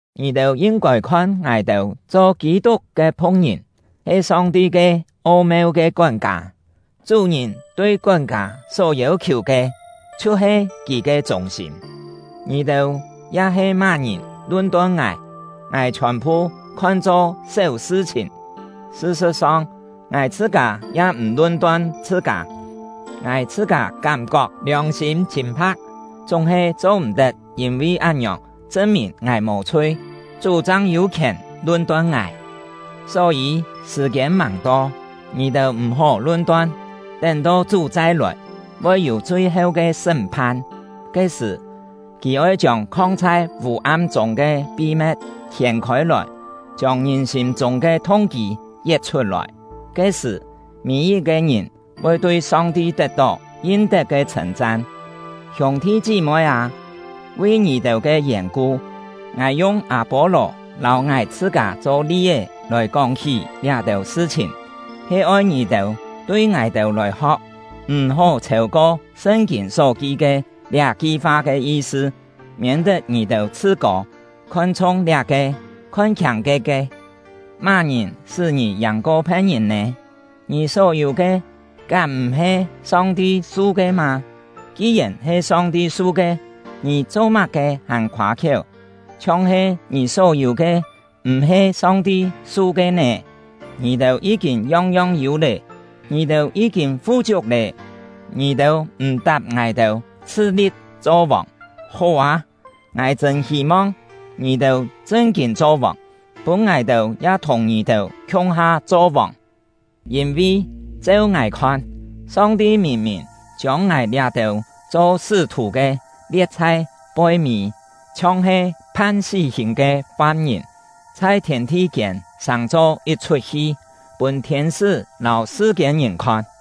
Ngì-têu yin-kôi khon ngài-têu cho Kî-tuk ke phu̍k-ngìn, he Song-ti ke o-meu ke kón-kâ. Chú-ngìn tui kón-kâ só yêu-khiù ke, chhiu-he kì ke chûng-sîm. Ngì-têu ya-he má-ngìn lun-ton ngài, ngài chhiòn-phu khon-cho séu sṳ-chhìn; sṳ-sṳ̍t-song, ngài chhṳ-kâ ya m̀ lun-ton chhṳ-kâ. Ngài chhṳ-kâ kám-kok liòng-sîm chhîn-pha̍k, chúng-he cho-m̀-tet yîn-vi án-ngiòng chṳn-mìn ngài mò-chhui. Chú chang yû khièn lun-ton ngài. Só-yî, sṳ̀-kiên màng to, ngì-têu m̀-hó lun-ton; tén-to Chú chai-lòi, voi yû chui-heu ke sṳ́m-phan. Ke-sṳ̀, kì oi chiông khong chhai vû-am chûng ke pi-me̍t hiên-khôi-lòi, chiông ngìn sîm-chûng ke thung-kî yet-chhut-lòi. Ke-sṳ̀, mî-yit-ke ngìn voi tui Song-ti tet-tó yin-tet ke chhṳ̂n-chan. Hiûng-thi chí-moi â, vi ngì-têu ke yèn-ku, ngài yung Â-pô-lò lâu ngài chhṳ-kâ cho li-é lòi kóng-hí liá-têu sṳ-chhìn, he oi ngì-têu tui ngài-têu lòi ho̍k “M̀-hó chhêu-ko Sṳn-kîn só ki ke” liá-ki fa ke yi-sṳ; miên-tet ngì-têu chhṳ-kô, khon-chhung liá-ke, khon-khiâng ke-ke. Má-ngìn sṳ́ ngì yàng-ko phe̍t-ngìn nè? Ngì só yû ke, kám m̀-he Song-ti su ke mâ? Ki-yèn he Song-ti su ke, ngì cho-má-ke hàn khoâ-khiéu, chhiong-he ngì só yû ke m̀-he Song-ti su ke nè? Ngì-têu yí-kîn yong-yong yû lé! Ngì-têu yí-kîn fu-chiuk lé! Ngì-têu m̀-tap ngài-têu, chhṳ-li̍p cho vòng! Hó â! Ngài chṳ̂n hî-mong ngì-têu chṳn-kîn cho vòng, pûn ngài-têu ya thùng ngì-têu khiung-ha cho vòng! Yîn-vi, cheu ngài khon, Song-ti mìn-mìn chiông ngài liá-têu cho sṳ́-thù ke lie̍t chhai poi-mî, chhiong-he phan sí-hìn ke fam-ngìn, chhai thiên-thi-kiên sàng-cho yit-chhut hi, pûn thiên-sṳ́ lâu sṳ-kiên-ngìn khon.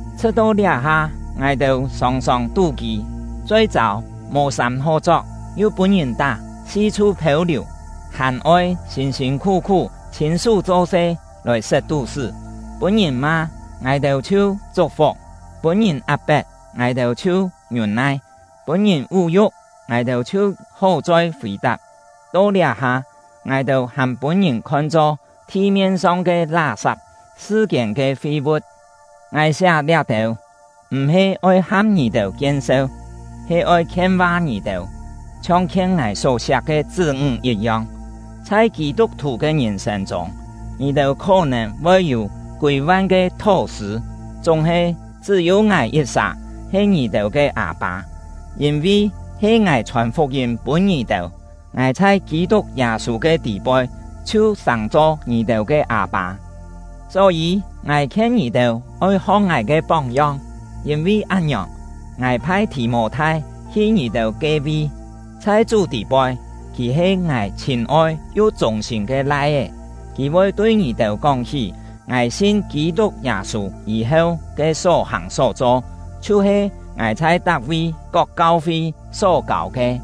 Chhṳ̍t-to liá-ha, ngài-têu sòng-sòng tú-kî, choi-châu, mò sâm hó chok, yu pûn-ngìn tá, si-chhu phêu-liù, hàn-oi sîn-sîn khú-khú chhîn-sú cho-se lòi set tú-sṳ́. Pûn-ngìn ma, ngài-têu chhiu chuk-fuk; pûn-ngìn ap-pet, ngài-têu chhiu ngiûn-nai; pûn-ngìn vú-yu̍k, ngài-têu chhiu hó-choi fì-tap. To liá-ha, ngài-têu hàn pûn-ngìn khon-cho thi-mien-song ke lá-sap, sṳ-kiên ke fi-vu̍t. Ngài siá liá-têu, m̀-he oi ham ngì-têu kien-seu, he oi khien-va ngì-têu, chhiong khien ngài só-siak ke chṳ́-ńg yit-yong. Chhai Kî-tuk-thù ke ngìn-sên chûng, ngì-têu khó-nèn voi yû kûi-van ke thó-sṳ̂, chúng-he chṳ́-yû ngài yit-sà he ngì-têu ke â-pâ; yîn-vi he ngài chhòn fuk-yîm pûn ngì-têu, ngài chhai Kî-tuk Yâ-sû ke tî-poi chhiu sàng-cho ngì-têu ke â-pâ. Só-yî, ngài khien ngì-têu oi ho̍k ngài ke póng-yong. Yîn-vi án-ngiòng, ngài phai Thì-mô-thai hi ngì-têu ke-vi; chhai Chú tî-poi kì he ngài chhîn-oi yu chûng-sîm ke lai-é. Kì voi tui ngì-têu kóng-hí ngài sin Kî-tuk Yâ-sû yî-heu ke só-hàng só-cho, chhiu-he ngài chhai tak-vi kok kau-fi só-kâu ke.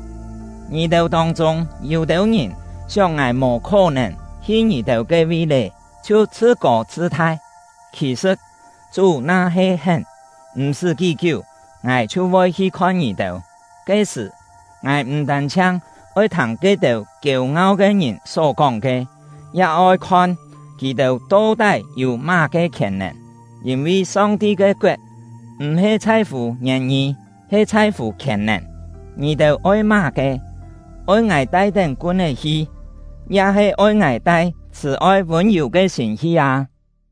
Ngì-têu tông-chûng, yû-têu ngìn sióng ngài mò khó-nèn hi ngì-têu ke-vi lé, chhiu chhṳ-kô chhṳ-thai. Khì-sṳ̍t, Chú na-he hén, m̀-sṳ́ kí-kiú ngài chhiu voi hi khon ngì-têu. Ke-sṳ̀, ngài m̀ tân-chhiang oi thâng ke-têu kiêu-ngau ke ngìn só kóng ke, ya oi khon kì-têu to-tái yû má-ke khièn-nèn. Yîn-vi Song-ti ke koet m̀-he chhai-fû ngièn-ngî, he chhai-fû khièn-nèn. Ngì-têu oi má-ke? Oi ngài tai-tén kun-é hi, ya-he oi ngài tai chhṳ̀-oi vûn-yù ke sîm hi â?